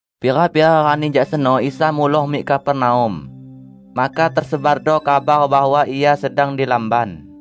Pira-pira rani jak seno Isa muloh mik Kapernaum. Maka tesebardo kabar bahwa Ia sedang di lamban.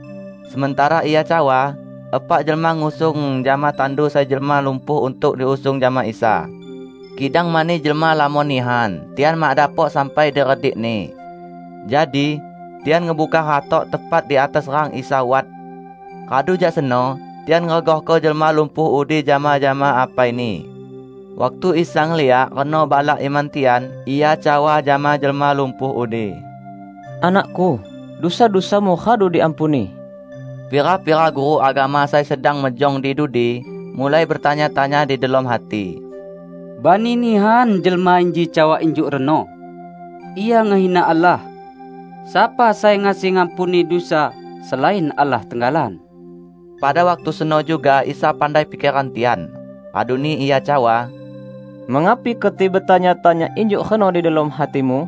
Sementara Ia cawa, epak jelma ngusung jama tandu sai jelma lumpuh untuk diusung jama Isa. Kidang mani jelma lamon nihan, tian mak dapok sampai di redik-Ni. Jadi, tian ngebungkar hatok tepat di atas rang Isa wat. Radu jak seno, tian ngeregahko jelma lumpuh udi jama-jama apaini. Waktu Isa ngeliak reno balak iman tian, Ia cawa jama jelma lumpuh udi, "Anak-Ku, dusa-dusamu radu diampuni." Pira-pira guru agama sai sedang mejong di dudi mulai betanya-tanya di delom hati, "Bani nihan jelma inji cawa injuk reno! Ia ngehina Allah. Sapa sai ngasi ngampuni dusa, selain Allah tenggalan?" Pada waktu seno juga Isa pandai pikeran tian. Raduni Ia cawa, "Mengapi keti betanya-tanya injuk reno di delom hatimu?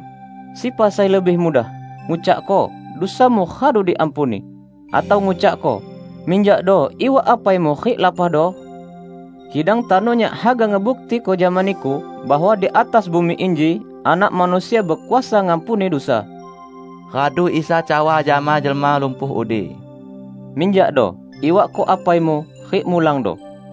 Sepa sai lebih mudah: ngucakko, 'Dusamu radu diampuni', atau ngucakko 'Minjakdo iwak apaimu rik lapahdo'? Kidang tano Nyak haga ngebuktiko jama niku bahwa di atas bumi inji Anak Manusia bekuasa ngampuni dusa." Radu Isa cawa jama jelma lumpuh udi, "Minjakdo, iwakko apaimu rik mulangdo!"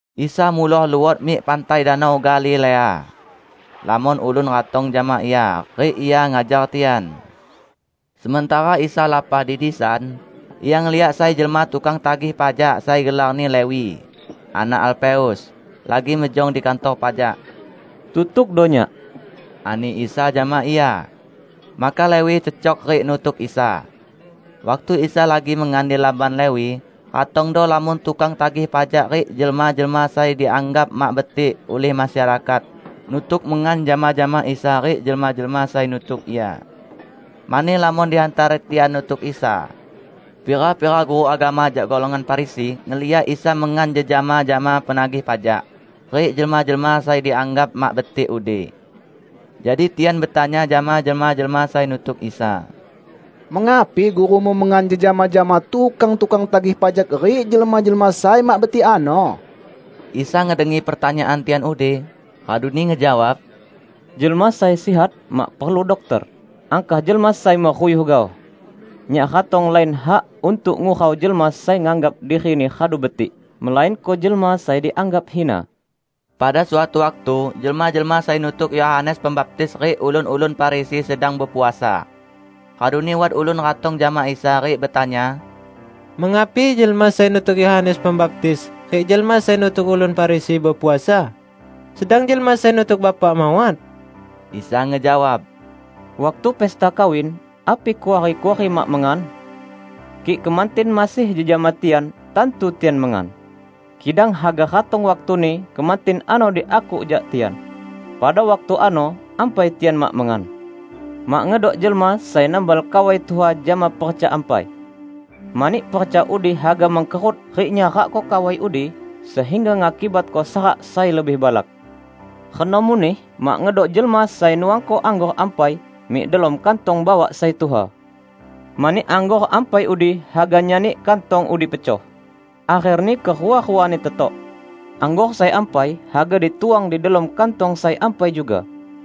Isa muloh luot mik pantai Danau Galilea. Lamon ulun ratong jama Ia, rik Ia ngajar tian. Sementara Isa lapah di disan, Ia ngeliak sai jelma tukang tagih pajak sai gelarni Lewi, anak Alfeus, lagi mejong di kantor pajak. "Tutukdo Nyak," ani Isa jama ia. Maka Lewi cecok rik nutuk Isa. Waktu Isa lagi mengan di lamban Lewi, ratongdo lamon tukang tagih pajak rik jelma-jelma sai dianggap mak betik ulih masyarakat nutuk mengan jama-jama Isa rik jelma-jelma sai nutuk Ia. Mani lamon di hantara tian nutuk Isa. Pira-pira guru agama jak golongan Farisi ngeliak Isa mengan jejama jama penagih pajak rik jelma-jelma sai dianggap mak betik udi. Jadi tian betanya jama jelma-jelma sai nutuk Isa, "Mengapi gurumu mengan jejama jama tukang-tukang tagih pajak rik jelma-jelma sai mak betik ano?" Isa ngedengi pertanyaan tian udi, raduni ngejawab, "Jelma sai sihat mak perlu dokter; angkah jelma sai meruyuh gaoh. Nyak ratong lain hak untuk ngurau jelma sai nganggap dirini radu betik, melainko jelma sai dianggap hina." Pada suatu waktu jelma-jelma sai nutuk Yohanes Pembaptis rik ulun-ulun Farisi sedang bepuasa. Raduni wat ulun ratong jama Isa rik betanya, "Mengapi jelma sai nutuk Yohanes Pembaptis rik jelma sai nutuk ulun Farisi bepuasa, sedang jelma sai nutuk Bapak mawat?" Isa ngejawab, "Waktu pesta kawin, api kuari-kuari mak mengan? Kik kemantin masih jejama tian, tantu tian mengan. Kidang haga ratong waktuni kemantin ano diakuk jak tian. Pada waktu ano ampai tian mak mengan. Mak ngedok jelma sai nambal kawai tuha jama perca ampai. Mani perca udi haga mengkerut rik nyarakko kawai udi, sehingga ngakibatko sarak sai lebih balak. Reno muneh mak ngedok jelma sai nuangko anggor ampai mik delom kantong bawak sai tuha. Mani anggor ampai udi haga nyani kantong udi pecoh. Akherni kerua-ruani tetok. Anggor sai ampai haga dituang di delom kantong sai ampai juga!"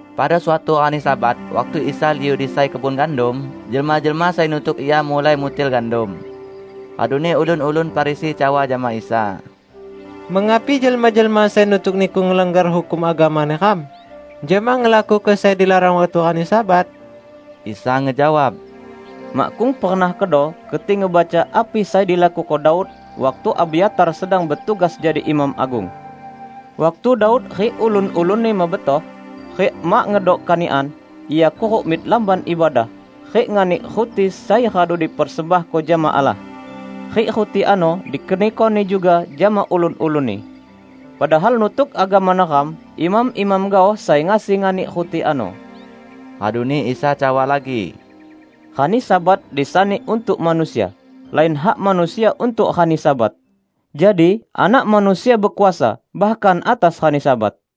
Pada suatu rani Sabat, waktu Isa liu di sai kebun gandum, jelma-jelma sai nutuk Ia mulai mutil gandum. Raduni ulun-ulun Farisi cawa jama Isa, "Mengapi jelma-jelma sai nutuk Niku ngelanggar hukum agama neram, jama ngelakuko sai dilarang waktu rani Sabat?" Isa ngejawab, "Makkung pernah kedo keti ngebaca api sai dilakuko Daud, waktu Abyatar sedang betugas jadi imam agung. Waktu Daud rik ulun-ulunni mebetoh, rik mak ngedok kanikan, ia kuruk mik Lamban Ibadah, rik nganik ruti sai radu dipersembahko jama Allah. Rik ruti ano dikenikoni juga jama ulun-ulunni. Padahal nutuk agama neram, imam-imam gaoh sai ngasi nganik ruti ano." Raduni Isa cawa lagi, "Rani Sabat disani untuk manusia; lain hak manusia untuk rani Sabat. Jadi, Anak Manusia bekuasa, bahkan atas rani Sabat."